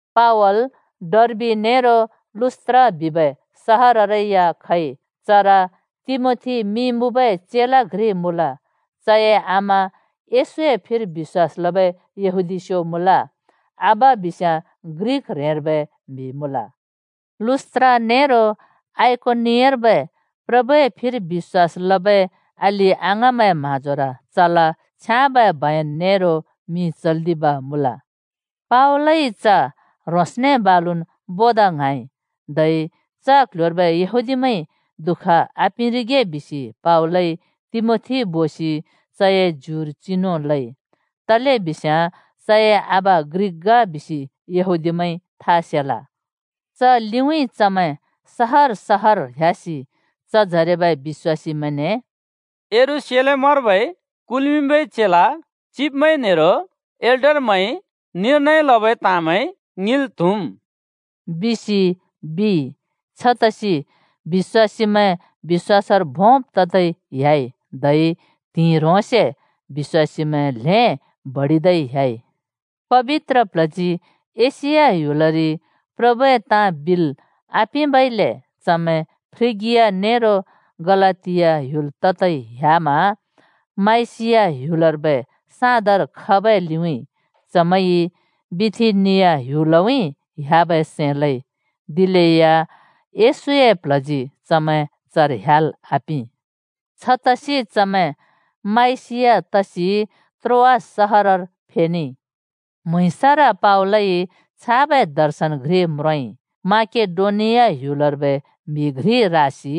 पावल डर्बि नेरो लुस्‍त्रा बिबै सहररै या खइ। चर तिमोथी मिं मुँबै चेला घ्रि मुँल। चए आमा येशूए फिर बिश्‍वास लबै यहूदीस्यो मुँल, आबा बिस्याँ ग्रिक ह्रेंर्बै म्हि मुँल। लुस्‍त्रा नेरो आइकोनियर्बै प्रभुए फिर बिश्‍वास लबै अलि-अङाँमैंए म्हाँजोर चला छ्याँबै बयन नेरो मिं चल्दिब मुँल। पावलइ च ह्रोंसने बालुन् बोदा ङ्हाँइ। धै च क्ल्ह्‍योर्बै यहूदीमैंइ दुःख आपिंरिगे बिसि पावलइ तिमोथी बोसि चए ज्युर चिनु लइ, तलेबिस्याँ चए आबा ग्रिक ग बिसि यहूदीमैंइ था सेला च लिउँइँ चमैंइ चमैं सहर सहरर ह्‍यासि चजरेबै बिश्‍वासीमैंने “यरूशलेमर्बै कुल्मिंबै चेला चिब्मैं नेरो एल्डरमैंइ निर्नय लबै ताँमैं ङिंल् त्हुम्,” बिसि बिइ। छतसि बिश्‍वासीमैं बिश्‍वासर भोंब् ततै ह्‍याइ धै त्हिंइ ह्रोंसे बिश्‍वासीमैं ल्हें बडिदै ह्‍याइ। पबित्र प्ल्हजी एशिया ह्‍युलरि प्रभुए ताँ बिल् आपिंबइले चमैं फ्रिगिया नेरो गलातिया ह्‍युल ततै ह्‍यामा माइसिया ह्‍युलर्बै साँदर खबै लिउँइँ चमैंइ बिथिनिया ह्‍युलउँइँ ह्‍याबै सैं लइ, दिलेया येशूए प्ल्हजी चमैं चर ह्‍याल् आपिं। छतसि चमैं माइसिया तसि त्रोआस सहरर फेनेइ। म्हुँइँसर पावलइ छाबै दर्शन घ्रि म्रोंइ: माकेडोनिया ह्‍युलर्बै म्हि घ्रि रासि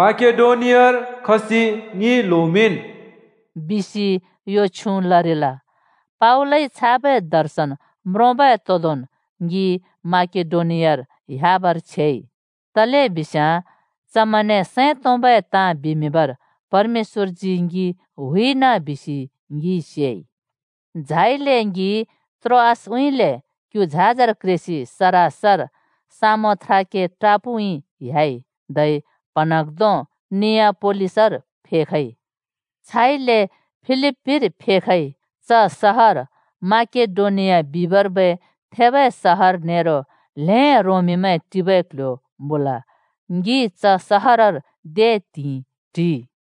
“माकेडोनियार खसि ङि ल्होमिंन्!” बिसि यो छ्युँ लरिल। पावलइ छाबै दर्शन म्रोंबै तोंदोंन् ङि माकेडोनियार ह्‍याबर छेइ। तलेबिस्याँ चमैंने सैं तोंबै ताँ बिमिंबर परमेश्‍वरजी ङि हुइना बिसि ङिइ सेइ। झाइले ङि त्रोआसउँइँले क्यु झाजर क्रेसि सरासर सामोथ्राके टापुउँइँ ह्‍याइ, धै प्हँन्हाँग्धों नियापोलिसर फेखइ। छाइले फिलिप्‍पीर फेखइ। च सहर माकेडोनिया बिबर्बै थेबै सहर नेरो ल्हें रोमीमैं टिबे क्ल्ह्‍यो मुँल। ङि च सहरर दे त्हिंइ टिइ।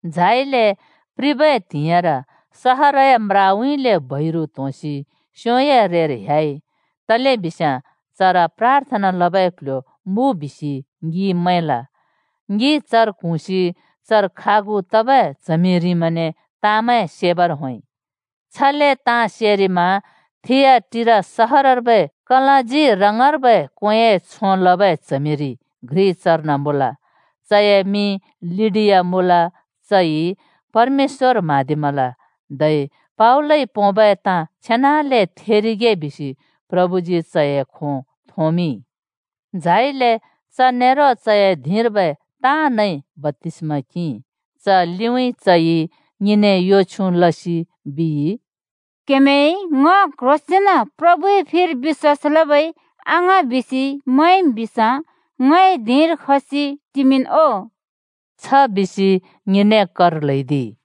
झाइले प्रिबै त्हिंइर सहरए म्राउँइँले बैरु त्होंसि स्योंए छेउर ह्‍याइ, तलेबिस्याँ चर प्राथना लबै क्ल्ह्‍यो मुँ बिसि ङिइ मैंल। ङि चर क्हुँसि चर खागु तबै च्हमिरिमैंने ताँमैं सेबर होंइ। छले ताँ सेरिमा थिआटीरा सहरर्बै कलाँजी रङबै क्वेंए छों लबै च्हमिरि घ्रि चर्न मुँल। चए मिं लिडिया मुँल। चइ परमेश्‍वर म्हाँदिमल धै पावलइ पोंबै ताँ छेनाले थेरिगे बिसि प्रभुजी चए खों थोंमिंइ। झाइले च नेरो चए धिंर्बै ताँनइ बप्‍तिस्मा किंइ। च लिउँइँ चइ ङिने यो छ्युँ लसि बिइ, “क्हेमैंइ ङ क्ह्रोंसेंन प्रभुए फिर बिश्‍वास लबै अङाँ बिसि मैंम् बिस्याँ ङए धिंर खसि टिमिंन् ओ।” छ बिसि ङिने कर ल्हैदिइ।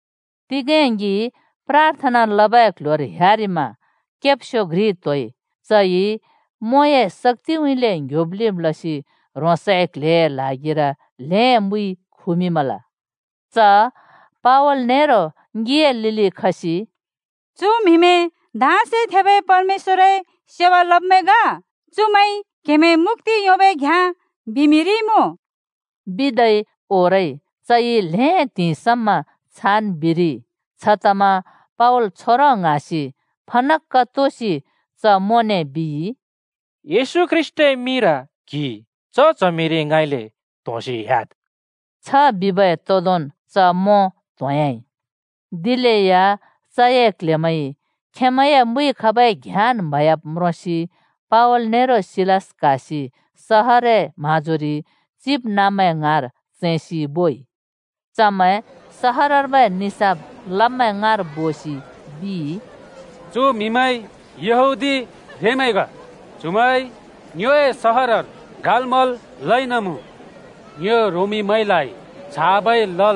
तिगें ङि प्राथना लबै क्ल्ह्‍योर ह्‍यारिमा मोंइ स्याबै केब्स्यो घ्रि त्होइ। चइ च मोंए शक्‍तिउँइँले ङ्‍ह्‍योब् लिब् लसि चए क्ल्हेए ल्हागिर ल्हें मुइ खुमिंमल। च पावल नेरो ङिए लिलि खसि, “चु म्हिमैं धाँसे थेबै परमेश्‍वरए सेवा लब्मैं ग। चुमैंइ क्हेमैं मुक्‍ति योंबै घ्याँ बिमिंरिमुँ,” बिदै ओरइ। चइ ल्हें त्हिंइ समा छान् बिरिइ। छतमा पावल छोंरों ङ्हाँसि फनक्‍क तोसि च मोंने बिइ, “येशू ख्रीष्‍टए मिंर क्हि च च्हमिरि ङाँइले त्होंसि ह्‍याद्।” छ बिबै तोंदोंन् च मों त्होंह्‍याइ। दिलेया चए क्ल्हेमैंइ खेंमैंए मुइ खबै घ्याँन् म्हयाब् म्रोंसि पावल नेरो सिलास क्हासि सहरए म्हाँजोरि चिबनाँब्मैं ङाँर चैंसि बोइ। चमैं सहरर्बै निसाफ लब्मैं ङाँर बोसि बिइ, “चु म्हिमैं यहूदी ह्रेंमैं ग। चुमैंइ ङ्योए सहरर गालमल् लइनमुँ। ङ्यो रोमीमैंइ छाब् ङिंल् ने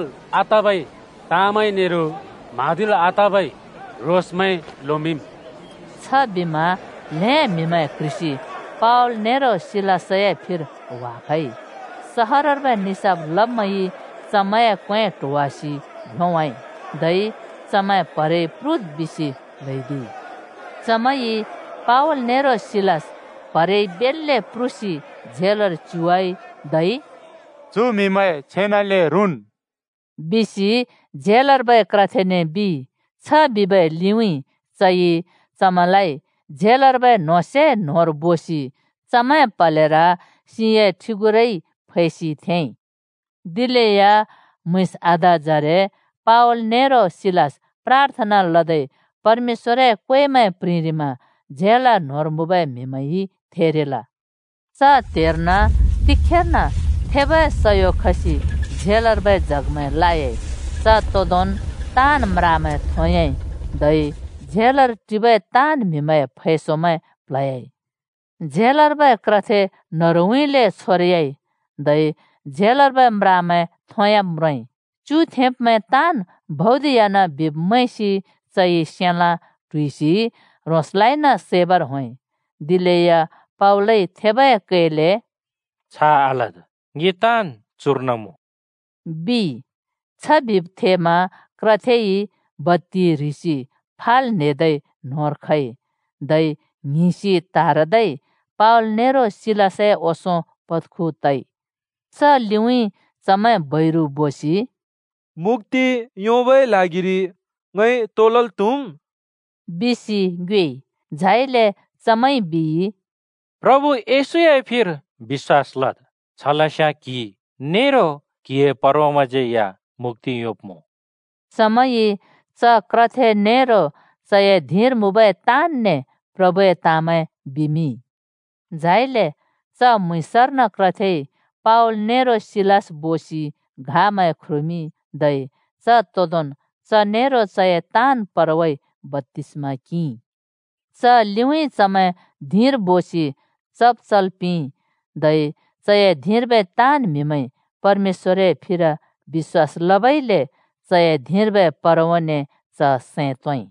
म्हाँदिल् आतबै ताँमैं चुमैंइ लोमिंम्।” छबिमा ल्हें म्‍हिमैं क्ह्रिसि पावल नेरो सिलासए फिर ह्‍वाखइ। सहरर्बै निसाफ लब्मैंइ चमैंए क्वें ट्होवासि भ्योंवाइ, धै चमैं प्हरेइ प्रुद् बिसि ल्हैदिइ। चमैंइ पावल नेरो सिलास प्हरेइ बेल्‍ले प्रुसि झेलर च्युवाइ, धै “चु म्हिमैं छेनाले रुँन्,” बिसि झेलर्बै क्रथेने बिइ। छ बिबै लिउँइँ चइ चमैंलाइ झेलर्बै न्होंसे न्होंर बोसि चमैंए प्हलेर सिंए ठिंगुरा क्योसि थेंइ। दिलेया म्‍हुँइँस आधाजरे पावल नेरो सिलास प्राथना लदै परमेश्‍वरए क्वेमैं प्रिंरिमा झेल न्होंर मुँबै म्हिमैंइ थेरिल। च त्हेर्न एक्‍कासि थेबै सयो खसि झेलर्बै जगमैं लायाइ। च तोंदोंन् ताँन् म्रामैं थोंयाइ धै झेलर टिबै ताँन् म्हिमैंए फैसोमैं प्ल्हयाइ। झेलर्बै क्रथे न्हरुउँइँले छोरयाइ। धै झेलर्बै म्रामैं थोंयाब् म्रोंइ। च्युथेंब्मैं ताँन् भौदिह्‍यान बिब् मैंसि चइ सेलाँ (तरवार) ट्हुइसि ह्रोंसलाइन सैबर होंइ। दिलेया पावलइ थेबै कैले “छ आलद्! ङि ताँन् चुर्न मुँ।” बिइ। छले थेमा क्रथेइ बत्ति ह्रिसि फाल् न्हेदै न्होंर खइ, धै ङ्हिंसि त्हारदै पावल नेरो सिलासए ओंसों पत्खु तइ। च लिउँइँ चमैं बैरु बोसि “मुक्‍ति योंबै ल्हागिरि ङइ तो लल् त्हुम्?” बिसि ङ्योएइ। झाइले चमैंइ बिइ, “प्रभु येशूए फिर बिश्‍वास लद्। छलस्याँ क्हि नेरो क्हिए परवाज्यै मुक्‍ति योंब्मुँ।” चमैंइ च क्रथे नेरो चए धिंर मुँबै ताँन‍ने प्रभुए ताँमैं बिमिंइ। झाइले च म्‍हुँइँसर्न क्रथेइ पावल नेरो सिलास बोसि घामैं ख्रुमिंइ। धै च तोंदोंन् च नेरो चए ताँन् परवाइ बप्‍तिस्मा किंइ। च लिउँइँ चमैं धिंर बोसि चब् चल् पिंइ, धै चए धिंर्बै ताँन् म्‍हिमैंइ परमेश्‍वरए फिर बिश्‍वास लबइले चए धिंर्बै परवाने च सैं तोंइ।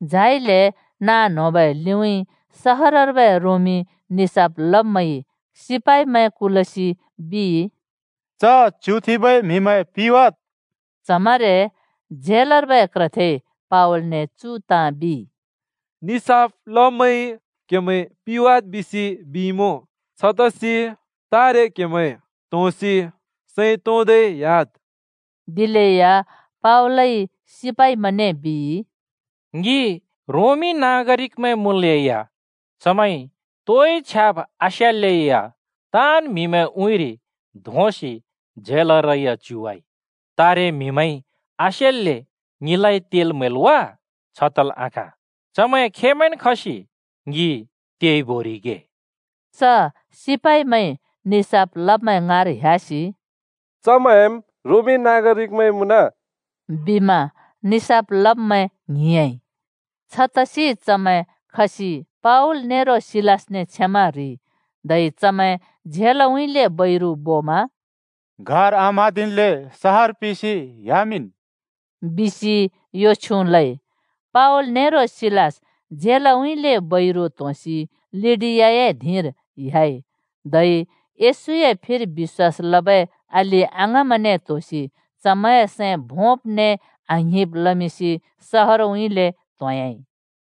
झाइले नाँ न्होंबै लिउँइँ सहरर्बै रोमी निसाफ लब्मैंइ पुलिसमैं कुलसि बिइ, “च च्युथेंबै म्हिमैं पिवाद्।” च्हमरे झेलर्बै क्रथेइ पावलने चु ताँ बिइ, “निसाफ लब्मैंइ क्हेमैं पिवाद् बिसि बिइमुँ। छतसि तारे क्हेमैं त्होंसि सैं तोंदै ह्‍याद्।” दिलेया पावलइ पुलिसमैंने बिइ, “ङि रोमी नागरिकमैं मुँलेया चमैंइ तोइ छ्याब् आस्यालेया ताँन् म्हिमैंए उँइँर धोंसि झेलरै या च्युवाइ। तारे म्हिमैंइ आसेल्‍ले ङिलाइ तेल् म्हैल् वा? छ तल् आखाँ। चमैं खेंमैंन् खसि ङि तेइ बोरिगे।” च पुलिसमैंइ निसाफ लब्मैं ङाँर ह्‍यासि “चमैंम् रोमीथेंमैं मुँन!” बिमा निसाफ लब्मैं ङ्हिंयाँइ। छतसि चमैं खसि पावल नेरो सिलासने क्षमा ह्रिइ, धै चमैं झेलउँइँले बैरु बोमा “गार आम्हाँदिल्‍ले सहर पिसि ह्‍यामिंन् ओ!” बिसि यो छ्युँ लइ। पावल नेरो सिलास झेलउँइँले बैरु त्होंसि लिडियाए धिंर ह्‍याइ। धै येशूए फिर बिश्‍वास लबै अलि-अङाँमैंने त्होसि चमैंए सैं भोंब् ने आङ्हिब् लमिंसि सहरउँइँले त्होंयाँइ।